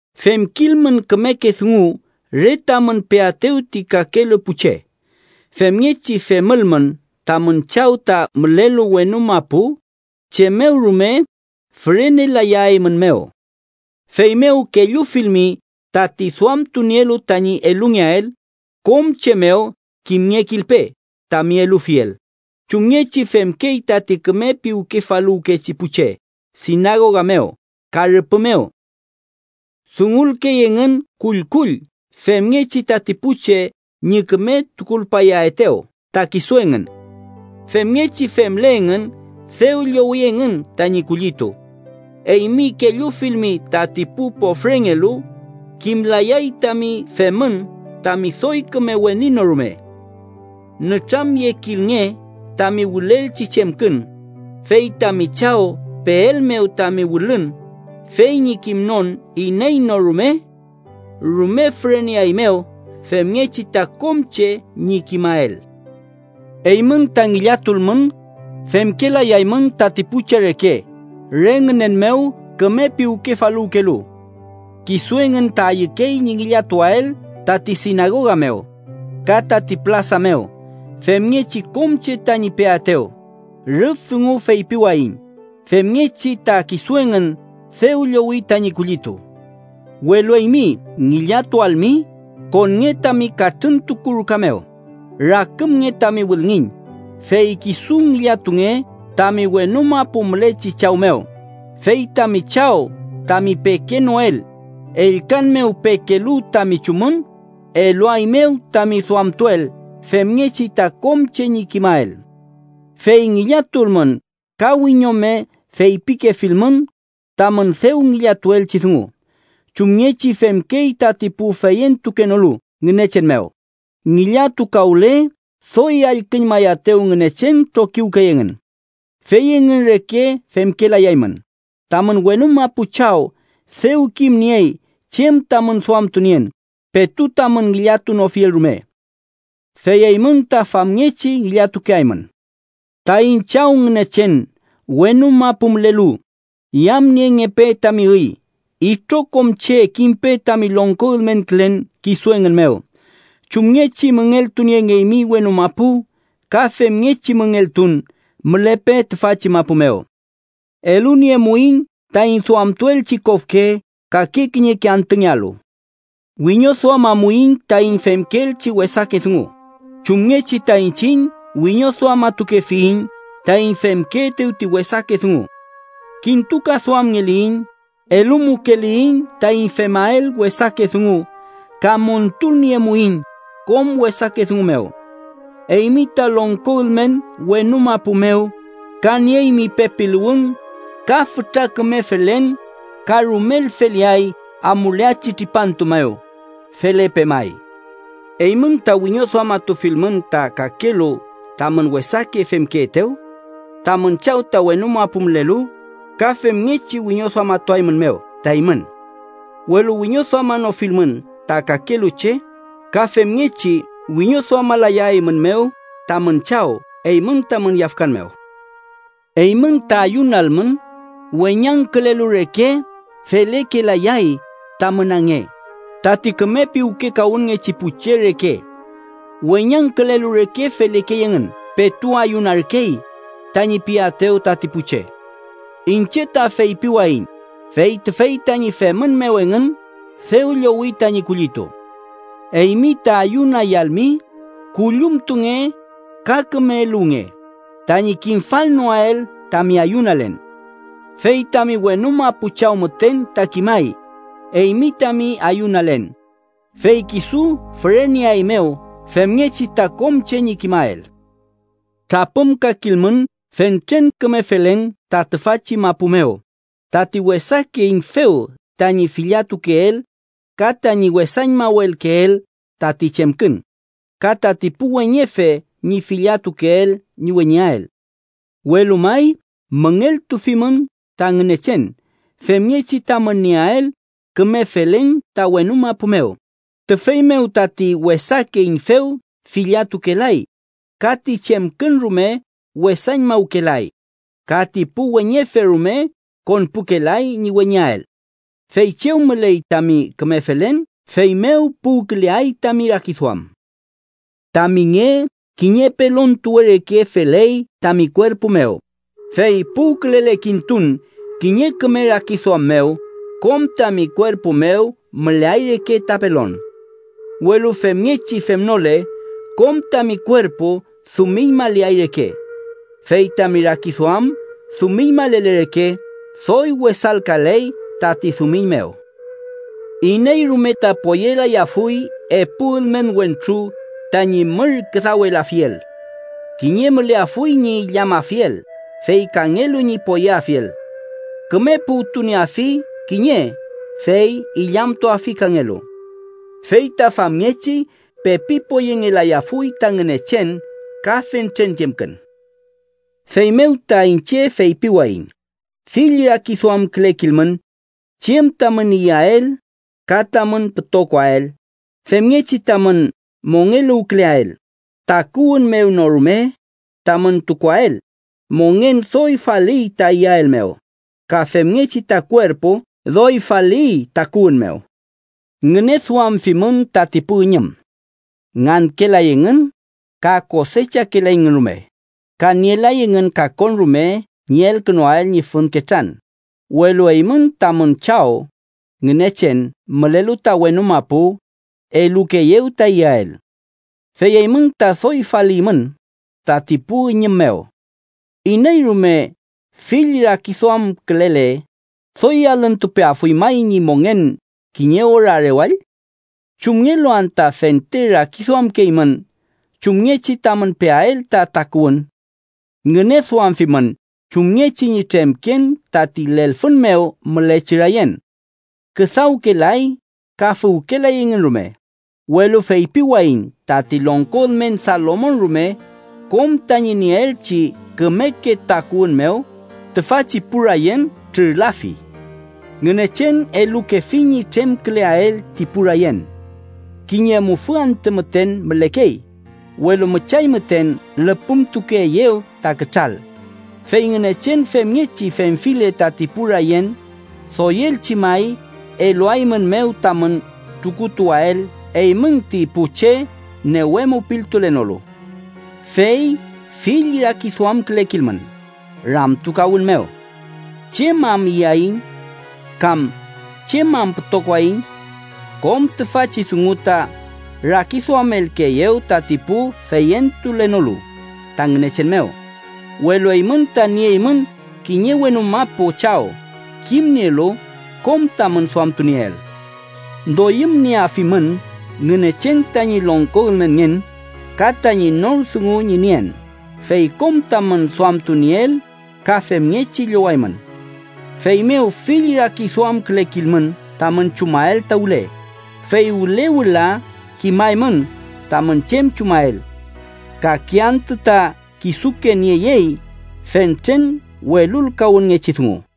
“Femkilmün kümeke dungu re tamün peaetew ti kakelu pu che. Femngechi femülmün, tamün Chaw ta mülelu wenu mapu chem mew rume fürenelayaeymünmew. “Feymew, kellufilmi tati duamtunielu tañi elungeael, kom che mew kimngekilpe tami elufiel, chumngechi femkey tati küme piwkefaluwkechi pu che sinagoga mew ka rüpü mew. Dungulkey engün kullkull femngechi tati pu che ñi küme tukulpayaetew ta kisu engün. Femngechi femle engün, dew llowi engün tañi kullitu. Eymi kellufilmi tati pu pofrengelu, kimlayay tami femün tami doy küme weni no rume. Nütramyekilnge tami wülelchi chemkün, fey tami Chaw peelmew tami wülün fey ñi kimnon iney no rume rume füreneaeymew femngechi ta kom che ñi kimael. “Eymün ta ngillatulmün, femkelayaymün tati pu che reke re ngünen mew küme piwkefaluwkelu. Kisu engün ta ayükey ñi ngillatuael tati sinagoga mew ka tati pülasa mew femngechi kom che tañi peaetew. Rüf dungu feypiwayiñ femngechi ta kisu engün dew llowi tañi kullitu. Welu eymi, ngillatualmi, konnge tami katrüntuku ruka mew, rakümnge tami wülngiñ, fey kisu ngillatunge tami wenu mapu mülechi Chaw mew. Fey tami Chaw tami pekenoel, ellkan mew pekelu tami chumün, eluaeymew tami duamtuel femngechi ta kom che ñi kimael. “Fey ngillatulmün ka wiñome feypikefilmün tamün dew ngillatuelchi dungu, chumngechi femkey tati pu feyentukenolu Ngünechen mew. Ngillatukawle doy allküñmayaetew Ngünechen trokiwkey engün. Fey engün reke femkelayaymün. Tamün wenu mapu Chaw dew kimniey chem tamün duamtunien, petu tamün ngillatunofiel rume. Fey eymün ta famngechi ngillatukeaymün: ‘Taiñ Chaw Ngünechen wenu mapu mülelu, yamniengepe tami üy. Itrokom che kimpe tami longko ülmenkülen kisu engün mew. Chumngechi müngeltuniengeymi wenu mapu, ka femngechi müngeltun mülepe tüfachi mapu mew. Eluniemuiñ taiñ duamtuelchi kofke kake kiñeke antüngealu. Wiñoduamamuiñ taiñ femkeelchi wesake dungu, chumngechi ta iñchiñ wiñoduamatukefiyiñ taiñ femkeetew ti wesake dungu. Kintukaduamngeliyiñ, elumukeliyiñ taiñ femael wesake dungu ka montulniemuiñ kom wesake dungu mew. Eymi ta longko ülmen wenu mapu mew ka nieymi pepiluwün ka fütra küme felen ka rumel feleay amuleachi tripantu mew. Felepe may.’ “Eymün ta wiñoduamatufilmün ta kakelu tamün wesake femkeetew, tamün Chaw ta wenu mapu mülelu ka femngechi wiñoduamatuaeymünmew ta eymün. Welu wiñoduamanofilmün ta kakelu che, ka femngechi wiñoduamalayaeymünmew tamün Chaw eymün tamün yafkan mew. “Eymün ta ayunalmün, weñangkülelu reke felekelayay tamün ange, tati küme piwkekawünngechi pu che reke. Weñangkülelu reke felekey engün ‘petu ayunarkey’ tañi piaetew tati pu che. Iñche ta feypiwayiñ fey tüfey tañi femün mew engün, dew llowi tañi kullitu. Eymi ta ayunayalmi, küllumtunge ka küme eluwnge tañi kimfalnoael tami ayunalen. Fey tami wenu mapu Chaw müten ta kimay eymi tami ayunalen, fey kisu füreneaeymew femngechi ta kom che ñi kimael. “Trapümkakilmün fentren küme felen ta tüfachi mapu mew, tati wesake üñfew tañi filladtukeel ka tañi wesañmawelkeel tati chemkün, ka tati pu weñefe ñi filladtukeel ñi weñeael. Welu may müngeltufimün ta Ngünechen femngechi tamün nieael küme felen ta wenu mapu mew, tüfey mew tati wesake üñfew filladtukelay ka ti chemkün rume wesañmawkelay ka ti pu weñefe rume konpukelay ñi weñeael. Fey chew müley tami küme felen, feymew puwküleay tami rakiduam. “Tami nge kiñe pelontuwe reke feley tami kuerpu mew, fey puwkülele kintun kiñe küme rakiduam mew, kom tami kuerpu mew müleay reke ta pelon. Welu femngechi femnole, kom tami kuerpu dumiñmaleay reke. Fey tami rakiduam dumiñmalele reke, ¡doy wesalkaley tati dumiñ mew! “Iney rume ta poyelayafuy epu ülmen wentru tañi mür küdawelafiel. Kiñe müleafuy ñi illamafiel, fey kangelu ñi poyeafiel. Küme puwtunieafi kiñe, fey illamtuafi kangelu. Fey ta famngechi pepi poyengelayafuy ta Ngünechen ka fentren chemkün. “Feymew ta, iñche feypiwayiñ: fill rakiduamkülekilmün chem tamün iyael ka tamün pütokoael femngechi tamün mongeluwküleael, takuwün mew no rume tamün tukuael. Mongen doy faliy ta iyael mew, ka femngechi ta kuerpu doy faliy takuwün mew. Ngüneduamfimün tati pu üñüm: ngankelay engün ka kosechakelayngün rume, ka nielay engün kakon rume ñi elkünuael ñi fün ketran, welu eymün tamün Chaw Ngünechen mülelu ta wenu mapu elukeeyew ta iyael. ¡Fey eymün ta doy faliymün tati pu üñüm mew! ¿Iney rume fill rakiduamkülele, doy alüntupeafuy may ñi mongen kiñe ora rewall? “¿Chumngelu anta fente rakiduamkeymün chumngechi tamün peael ta takuwün? Ngüneduamfimün chumngechi ñi tremken tati lelfün mew mülechi rayen: küdawkelay ka füwkelay engün rume. Welu feypiwayiñ tati longko ülmen Salomon rume, kom tañi nieelchi kümeke takuwün mew, tüfachi pu rayen mew trürlafi. Ngünechen elukefi ñi tremküleael ti pu rayen. Kiñe mufü antü müten mülekey, welu müchay müten lüpümtukeeyew ta kütral. Fey Ngünechen femngechi femfile tati pu rayen, doyelchi may eluaeymünmew tamün tukutuwael eymün, ti pu che newe mupiltulenolu. “Fey fill rakiduamkülekilmün, ramtukawün mew: ‘¿Chem am iyaiñ?’ kam ‘¿Chem am pütokoaiñ?’ Kom tüfachi dungu ta rakiduamelkeeyew tati pu feyentulenolu ta Ngünechen mew, welu eymün ta nieymün kiñe wenu mapu Chaw kimnielu kom tamün duamtunieel. Doyümnieafimün Ngünechen tañi longko ülmenngen ka tañi nor dungu ñi nien, fey kom tamün duamtunieel ka femngechi llowaymün. Feymew fill rakiduamkülekilmün tamün chumael ta wüle, fey wüle wüla kimaymün tamün chem chumael. Kake antü ta kisuke nieyey fentren welulkawünngechi dungu.